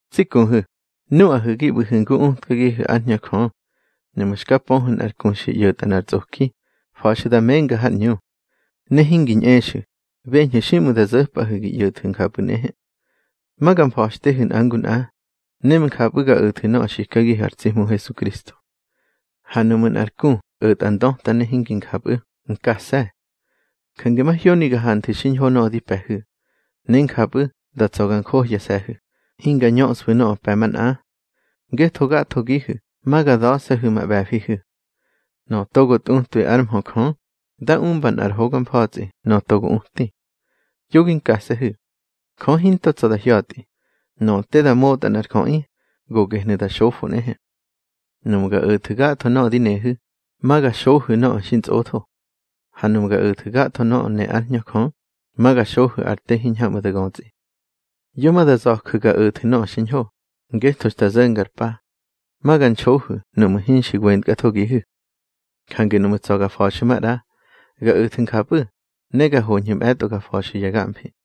Tsi kuhu̱, nuꞌahu̱ gi ꞌbu̱hu̱ ngu utkagihu̱ ár Hñö Jö, nuꞌmu̱ xka pöhu̱ nꞌar ku xi ꞌyo̱tꞌa nꞌar tsꞌoki, fa̱xu̱ da menga har ꞌñu. Ne hingi ñꞌexu̱, beñhu̱ xiꞌmu̱ da zo̱pꞌahu̱ gi ꞌyo̱thu̱ njapꞌu̱ nꞌehe. Ma ga mfa̱xtehu̱ nꞌa ngu nꞌa, ne njapꞌu̱ ga o̱thu̱ nöꞌö xikagihu̱ ar tsi Hmu Hesukristo. Ha nuꞌmu̱ nꞌar ku o̱tꞌa ndöta ne hingi njapꞌu̱, nkase̱. Jange mahyoni ga hanthu̱ xiñho nöꞌö di pe̱hu̱, ne njapꞌu̱ da tsa̱ ga njohyase̱hu̱, hinga ñöꞌsfu̱ nöꞌö pe̱ manꞌa. Ngetho gathogihu̱ ma ga da̱se̱hu̱ ma ꞌbe̱fihu̱. Nöꞌö togo tꞌutwabi ár mhö Jö, dá umba nꞌar hoga mfa̱tsꞌi nöꞌö togo uti. Yo gi nkase̱hu̱. Jö hinto tsa̱ da hya̱tꞌi. Nöꞌö te da motꞌa nꞌar jöꞌi, go gehnu̱ da xofo nꞌehe. Nuꞌmu̱ ga o̱thu̱ gatho nöꞌö di nehu̱, ma ga xohu̱ nöꞌö xintsꞌotho. Ha nuꞌmu̱ ga o̱thu̱ gatho nöꞌö ne ár Hñö Jö, ma ga xohu̱ ar te hiñhamꞌu̱ da götsꞌi. Yo ma da za̱ju̱ ga o̱thu̱ nöꞌö xiñho, ngetho xta zo̱nga ar pa, ma ga nxohu̱ nuꞌmu̱ hinxi wentkathogihu̱. Jange nuꞌmu̱ tsa̱ ga fa̱xu̱ maꞌra, ga o̱thu̱ njapꞌu̱, ne ga hoñhu̱ mꞌe̱tꞌo ga fa̱xu̱ ya gamfi.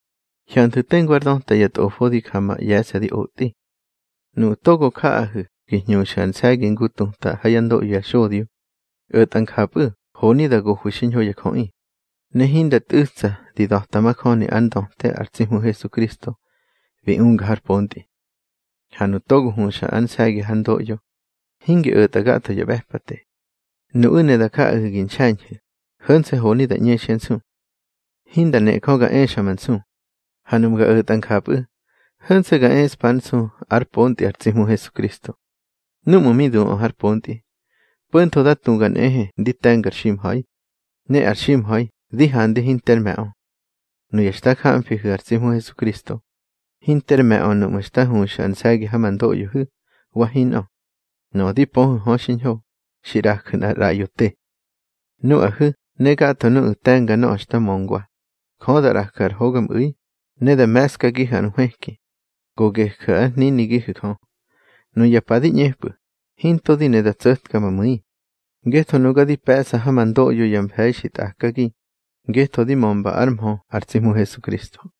Hyanthu̱ tengu ár döta ya tꞌofo di ja ma ꞌye̱se̱ di otꞌi. Nuꞌu̱ togo jaꞌahu̱ gi hñuxu̱ ar nse̱gi ngu tuta ha yá ndoꞌyo ya xodyo, o̱tꞌa njapꞌu̱ honi da gohwi xiñho ya jöꞌi, ne hinda ntꞌu̱tsa di da̱ta majöni ár ndöte ar tsi Hmu Hesukristo bi unga har pontꞌi. Ha nuꞌu̱ togo huxa ar nse̱gi hár ndoꞌyo, hingi o̱tꞌa gatho ya ꞌbe̱pate. Nuꞌu̱ ne da jaꞌahu̱ gi nxe̱ñhu̱, ho̱nse̱ honi da ꞌñexyá nsu. Hinda ne Jö ga exa ma nsu. Ha nuꞌmu̱ ga o̱tꞌa njapꞌu̱, ho̱nse̱ ga eꞌspár nsu ár pontꞌi ar tsi Hmu Hesukristo. Núꞌmu̱ mi duꞌö har pontꞌi, po̱ntho da tuga nꞌehe ndi te̱ngar ximha̱i, ne ar ximha̱i di handi hinter me̱ꞌö. Nuya xta jamfihu̱ ar tsi Hmu Hesukristo, hinter me̱ꞌö nuꞌmu̱ xta huxu̱ ar nse̱gi ha ma ndoꞌyohu̱ wa hinꞌö. Nöꞌö di pöhu̱ hö xiñho, xi ꞌraju̱ nꞌar ꞌraꞌyo te. Nuꞌahu̱ ne gatho nuꞌu̱ te̱nga nöꞌö xta möngwa, Jö da ꞌraju̱ ar hogamꞌu̱i, ne da me̱skagihu̱ ar nhwëki, go geju̱ ár hninigihu̱ Jö. Nuya pa di ꞌñepꞌu̱, hinto di ne da tso̱tka ma mu̱i, ngetho nuga di pe̱ꞌsa ha ma ndoꞌyo ya mfe̱i xi tꞌakagi ngetho di mömba ár mhö ar tsi Hmu Hesukristo.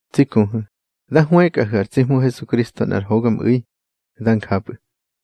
Tsi kuhu̱, da hwëkꞌahu̱ ar tsi Hmu Hesukristo nꞌar hogamꞌu̱i. Dá njapꞌu̱.